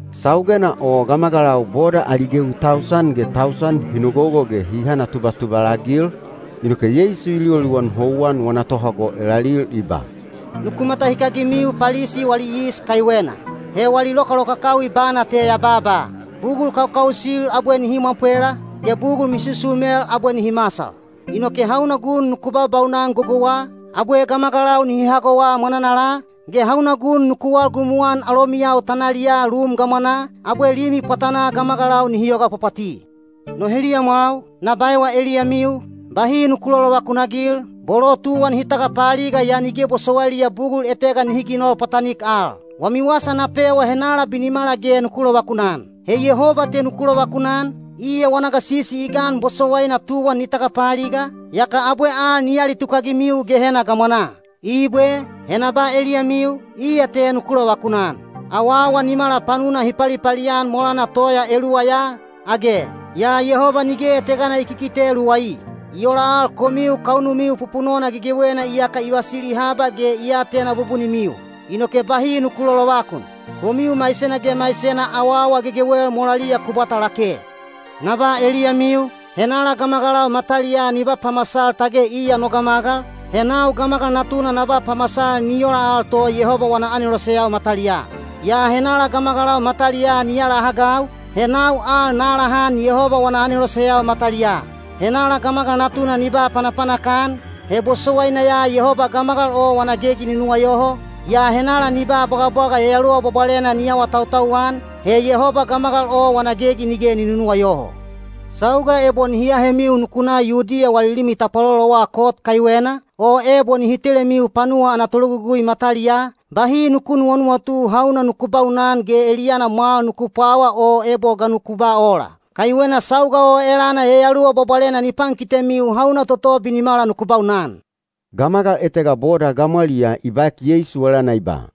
Saugena o gamagalau boda ali gewi tausan ge tausan hi nogogo ge hi hanatubatubal-agil, inoke Yeisu i liwaliwan houwan wana tohago elalil i ba, “Nuku matahikagimiu Palisi wali yis kaiwena. He wali lokalokakawi bana te ya babaa. Bugul kaukausil abwe nihi mwapwela, ge bugul misusumel abwe nihi masal. Inoke hauna gun nuku baubaunan gogouwa, abwe gamagalau nihi hagowa mwananala, ge hauna gun nuku walgumuan alomiyau tanaliyaa lum gamwanaa, abwe limi pwatanaa gamagalau nihi yoga pwapwati. No heliyamwau, na baewa eliyamiu, bahi nuku lolovakun-agil, bolo tuwan hi tagapaaliga yaa nige bosowailiya bugul etega nihi ginol pwatanik al. Wami wasa na pewa henala binimala ge nuku lovakunan: he Yehoba te nuku lovakunan, iya wana gasisi i gan bosowaina tuwan ni tagapaaliga, yaka abwe al ni alitukagimiu Gehena gamwanaa. Ibwe, he na ba eliyamiu, iya te nuku lovakunan. Awaawa nimala panuna hi palipali-an molana toya eluwa ya, age? Yaa Yehoba nige etegana i kikite luwai. I ola al komiu kaunumiu pupunona gegewena iyaka i vasili haba ge i atena bubunimiu. Inoke bahi nuku lolovakun. Komiu maisena ge maisena awaawa gegewel molaliya ku bwata lake. Na ba eliyamiu, henala gamagalau mataliyaa ni ba pamasal tage iya no gamagal, he nau Gamagal Natuna na ba pamasal ni ola al to Yehoba wana aneloseyau mataliyaa. Yaa henala gamagalau mataliyaa ni alahagau, he nau al na alahan Yehoba wana aneloseyau mataliyaa. Henala Gamagal Natuna ni ba panapanak-an, he bosowaina ya Yehoba gamagal o wana gegi ni nuwayoho, yaa henala ni ba bwagabwaga Yayaluwa Bwabwalena ni awatautau-an, he Yehoba gamagal o wana gegi nige ni nunuwayoho. Sauga ebo nihi ahemiu nuku na Yudiya wali limi tapwalolowa kot kaiwena, o ebo nihi telemiu panuwa ana tologugui mataliyaa, bahi nuku nuwanuwatu hauna nuku baunan ge eliyana mwal nuku pwawa o ebo ga nuku ba ola. Kaiwena sauga o elana Yayaluwa Bwabwalena ni pankitemiu hauna toto binimala nuku baunan.” Gamagal etega boda gamwaliyaa i baek Yeisu elana i ba,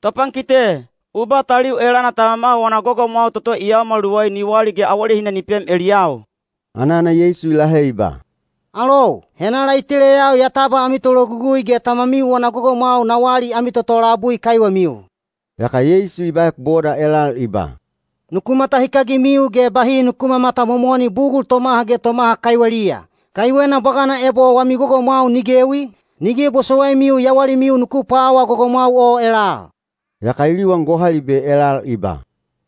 “Topankite, u ba taliu elana tamama wana gogomwau toto i yaomal luwai ni wali ge awalehina ni pem eliyau.” Anana Yeisu i lahe i ba, “Alou, henala i teleyau ya tabwa ami tologugui ge tamamiu wana gogomwau na wali ami toto labui kaiwemiu?” Yaka Yeisu i baek boda elal i ba, “Nuku matahikagimiu ge bahi nuku mamatamomoni bugul tomaha ge tomaha kaiweliya; kaiwena bwagana ebo wami gogomwau ni gewi, nige bosowaimiu yawalimiu nuku pwawaa gogomwau o elal.” Yaka i liwan gohalibe elal i ba,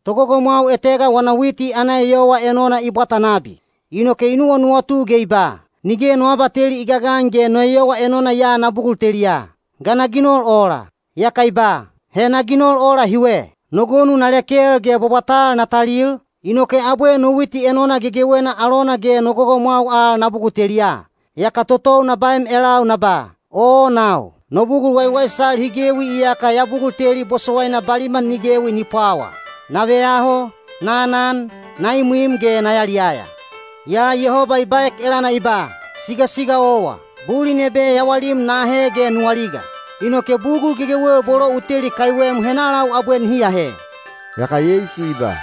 “Togogomwau etega wana witi ana eyowa enona i bwata nabi. Inoke i nuwanuwatu ge i ba, ‘Nige no abateli i gagan ge no eyowa enona ya na bugul teliya. Ga na ginol ola?’ “Yaka i ba, ‘He na ginol ola hiwe. No gonu na lekel ge bwabwatal na talil, inoke abwe no witi enona gegewena alona ge no gogomwau al na bugul teliya. Yaka totou na baem elau na ba: Oo nau! No bugul waiwaisal hi gewi iyaka ya bugul teli bosowaina baliman ni gewi ni pwawa. Na veyaho, na anan, na imwim ge na yaliyaya.’ “Yaa Yehoba i baek elana i ba, ‘Sigasiga owa! Bulin ebe yawalim na ahe ge nu aliga. Inoke bugul gegewel bolo u teli kaiwem henalau abwe nihi ahe?’” Yaka Yeisu i ba,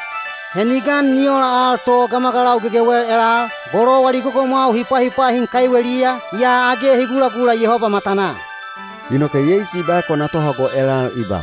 “He ni gan ni ola al to gamagalau gegewel elal, bolo wali gogomwau hi pwahipwahin kaiweliya, yaa age hi gulagula Yehoba matanaa.” Inoke Yeisu i baek wana tohago elal i ba,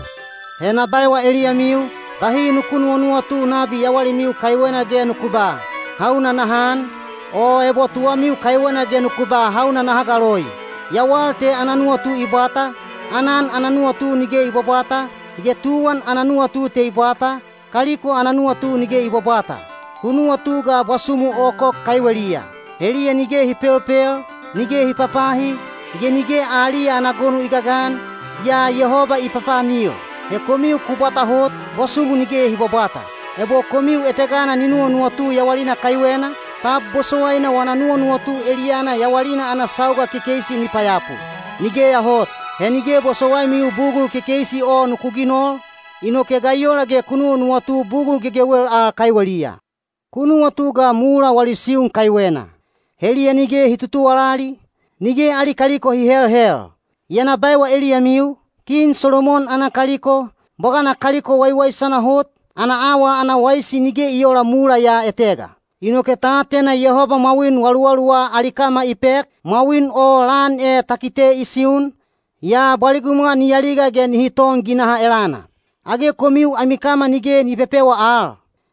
“He na baewa eliyamiu, bahi nuku nuwanuwatu nabi yawalimiu kaiwena ge nuku ba, ‘Hauna naha an?’ o ebo tuwamiu kaiwena ge nuku ba ‘Hauna naha galoi?’ Yawal te ana nuwatu i bwata, aanan ana nuwatu nige i bwabwata, ge tuwan ana nuwatu te i bwata, kaliko ana nuwatu nige i bwabwata. Ku nuwatu ga bwasumu okok kaiweliya. Heliya nige hi pelpel, nige hi papahi, ge nige aliya ana gonu i gagan, yaa Yehoba i papaanil. He komiu ku bwata hot, bwasumu nige hi bwabwata. Ebo komiu etegana ni nuwanuwatu yawalina kaiwena, tab bosowaina wana nuwanuwatu eliyana yawalina ana sauga kekeisi ni payapu? Nigeya hot! He nige bosowaimiu bugul kekeisi o nuku ginol, inoke ga i ola ge ku nuwanuwatu bugul gegewel al kaiweliya? Ku nuwatu ga mula wali siun kaiwena: heliya nige hi tutuwalali, nige ali kaliko hi helhel. Yaa na baewa eliyamiu, kin Solomon ana kaliko, bwagana kaliko waiwaisana hot, ana awa ana waisi nige i oola mula ya etega. Inoke ta atena Yehoba mwawin waluwaluwa ali kama i pek, mwawin o lan e ta kite i siun, yaa bwaligumwa ni aliga ge nihi ton ginaha elana. Age komiu ami kama nige ni pepewa al?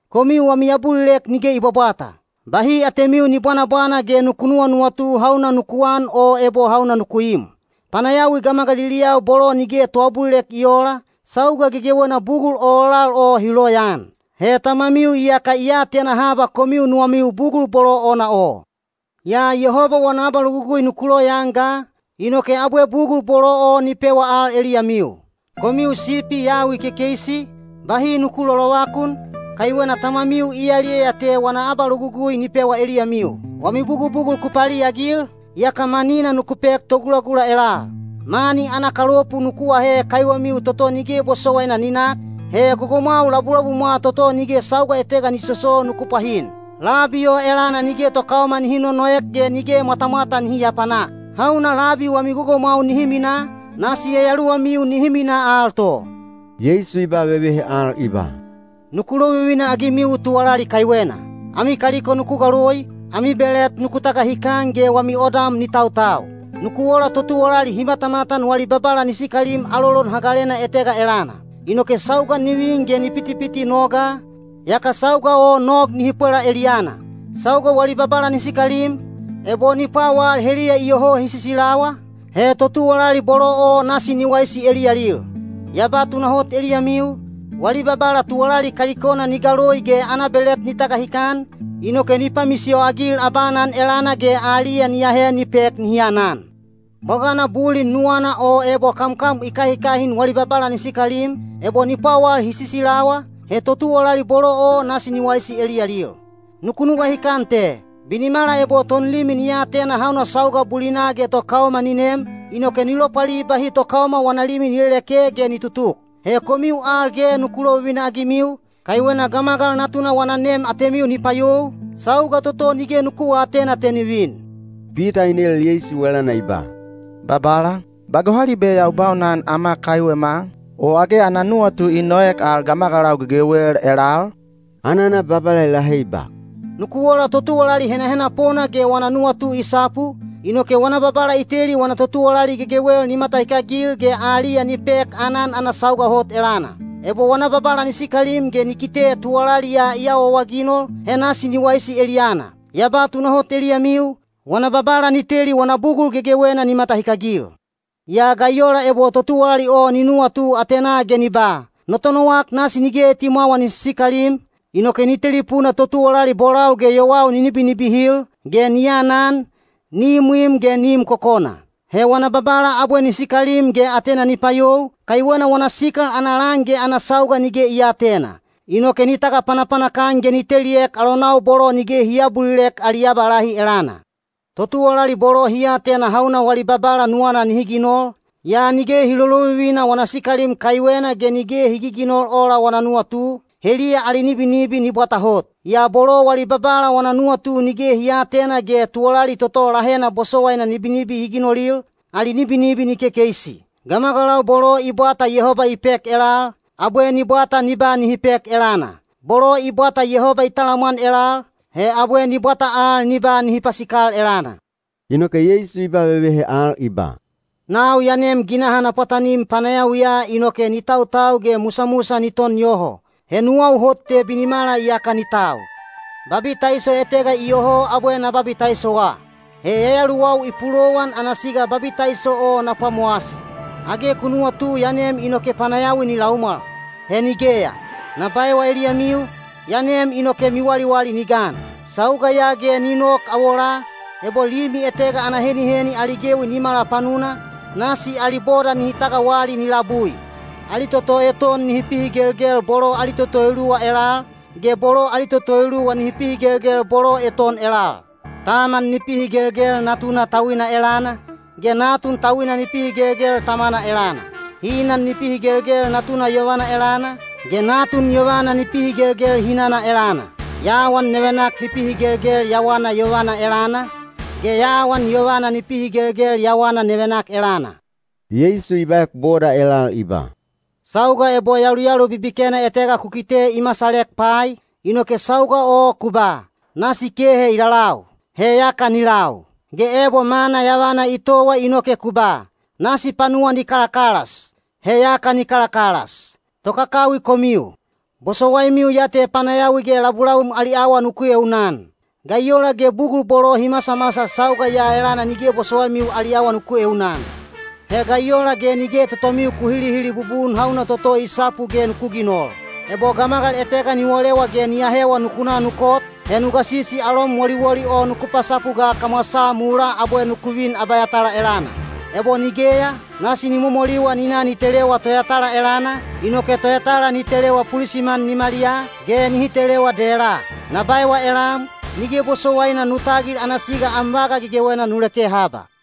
Komiu wami abulilek nige i bwabwata. Bahi atemiu ni bwanabwana ge nuku nuwanuwatu hauna nuku an o ebo hauna nuku im. Panayawi gamagaliliyau bolo nige toabulilek i oola, sauga gegewena bugul ololal o hi loyaan. He Tamamiu iyaka i atena haba komiu nuwamiu bugul bolo ona o. Yaa Yehoba wana abalogugui nuku loyaan ga, inoke abwe bugul bolo o ni pewa al eliyamiu. Komiu sipi yawi kekeisi, bahi nuku lolovakun, kaiwena Tamamiu i yaliyaya te wana abalogugui ni pewa eliyamiu. Wami bugubugul ku paliagil, yaka manina nuku pek togulagula elal. Mani ana kalopu nuku ahe kaiwemiu toto nige bosowaina ni nak, he gogomwau labulabumwa toto nige sauga etega ni soso nuku pwahin. Labi o elana nige tokaoma nihi nonoek ge nige mwatamwata nihi aapanak. Hauna labi wami gogomwau nihi minaa, nasi yayaluwamiu nihi minaa al to.” Yeisu i ba vevehe al i ba, “Nuku lovivina-agimiu tuwalali kaiwena: ami kaliko nuku galoi, ami belet nuku tagahikan ge wami odam ni tautau. Nuku ola totuwalali hi matamatan wali babala ni sikalim alolon hagalena etega elana. Inoke sauga ni vin ge ni pitipiti noga, yaka sauga o nog nihi pwela eliyana. Sauga wali babala ni sikalim, ebo ni pwawal heliya iyoho hi sisilawa, he totuwalali bolo o nasi ni waisi eliyalil. Ya ba tunahot eliyamiu, wali babala tuwalali kalikona ni galoi ge ana belet ni tagahikan, inoke ni pamisiyo-agil abaanan elana ge aliya ni ahe ni pek nihi anan. Bwagana bulin nuwana o ebo kamkam i kahikahin wali babala ni sikalim, ebo ni pwawal hi sisilawa, he totuwalali bolo o nasi ni waisi eliyalil. Nuku nuwahikan te: binimala ebo tonlimi ni atena hauna sauga bulina ge tokaoma ni nem, inoke ni lopwali bahi tokaoma wana limi ni leleke ge ni tutuk. He komiu al ge nuku lovivina-agimiu, kaiwena Gamagal Natuna wana nem atemiu ni payou, sauga toto nige nuku aatena te ni vin.” Pita i nel Yeisu elana i ba, “Babala, ba gohalibe ya u baunan ama kaiwema, o age ana nuwatu i noek al gamagalau gegewel elal?” Anana Babala i lahe i ba, “Nuku ola totuwalali henahenapona ge wana nuwatu i sapu, inoke wana babala i teli wana totuwalali gegewel ni matahikagil ge aliya ni pek aanan ana sauga hot elana. Ebo wana babala ni sikalim ge ni kite tuwalali ya i awaawaginol, he nasi ni waisi eliyana. Ya ba tunahot eliyamiu, wana babala ni teli wana bugul gegewena ni matahikagil. Yaa ga i ola ebo totuwalali o ni nuwatu atenaa ge ni ba, ‘No tonowak nasi nige etimwawa ni sisikalim,’ inoke ni telipuna totuwalali bolau ge yowau ni nibinibihil, ge ni anan, ni imwim ge ni im kokona. He wana babala abwe ni sikalim ge atena ni payou, kaiwena wana sikal ana lan ge ana sauga nige i aatena. Inoke ni tagapanapanak-an ge ni teliek alonau bolo nige hi aabulilek ali abalahi elana. “Totuwalali bolo hi atena hauna wali babala nuwana nihi ginol, yaa nige hi lolovivina wana sikalim kaiwena ge nige hi giginol ola wana nuwatu, heliya ali nibinibi ni bwata hot. Yaa bolo wali babala wana nuwatu nige hi aatena ge tuwalali toto lahena bosowaina nibinibi hi ginolil, ali nibinibi ni kekeisi. Gamagalau bolo i bwata Yehoba i pek elal, abwe ni bwata ni ba nihi pek elana. Bolo i bwata Yehoba i talamwan elal, he abwe ni bwata al ni ba nihi pasikal elana.” Inoke Yeisu i ba vevehe al i ba, “Nau ya nem ginaha na pwatanim panayawiya inoke ni tautau ge musamusa ni ton yoho. He nuwau hot te binimala iyaka ni tau. Babitaiso etega iyoho abwe na babitaisowa. He yayaluwau i pulowan ana siga babitaiso o na pwamowasi. Age ku nuwatu ya nem inoke panayawi ni laumwal? He nigeya. Na baewa eliyamiu, ya nem inoke miwaliwali ni gan. Sauga ya ge ni nok awolaa, ebo limi etega ana heniheni ali gewi nimala panuna, nasi ali boda nihi tagawali ni labui. Ali toto eton nihi pihigelgel bolo ali toto eluwa elal, ge bolo ali toto eluwa nihi pihigelgel bolo eton elal. Taman ni pihigelgel natuna tauina elana, ge natun tauina ni pihigelgel tamana elana. Hinan ni pihigelgel natuna yovana elana, ge natun yovana ni pihigelgel hinana elana. Yawan nevenak ni pihigelgel yawana yovana elana, ge yawan yovana ni pihigelgel yawana nevenak elana.” Yeisu i baek boda elal i ba, “Sauga ebo yaluyalu bibikena etega ku kite i masalek pai, inoke sauga o ku ba, ‘Nasi kehe i lalau.’ He yaka ni lau. Ge ebo mana yavana i towa inoke ku ba, ‘Nasi panuwa ni kalakalas.’ He yaka ni kalakalas. Tokakawi komiu! Bosowaimiu ya te panayawi ge labulabum ali awa nuku eunaan. Ga i ola ge bugul bolo hi masamasal sauga ya elana nige bosowaimiu ali awa nuku eunaan? “He ga i ola ge nige totomiu ku hilihili bubun hauna toto i sapu ge nuku ginol? Ebo gamagal etega ni wolewa ge ni ahewa nuku na nu kot, he nu gasisi alom woliwoli o nuku pasapu ga kamwasaa mulaa abwe nuku vin abayatala elana. Ebo nigeya, nasi ni momoliwa ni na ni telewa toyatala elana, inoke toyatala ni telewa pulisiman nimaliyaa, ge nihi telewa dela. Na baewa elam, nige bosowaina nu tagil ana siga am vaga gegewena nu leke haba.”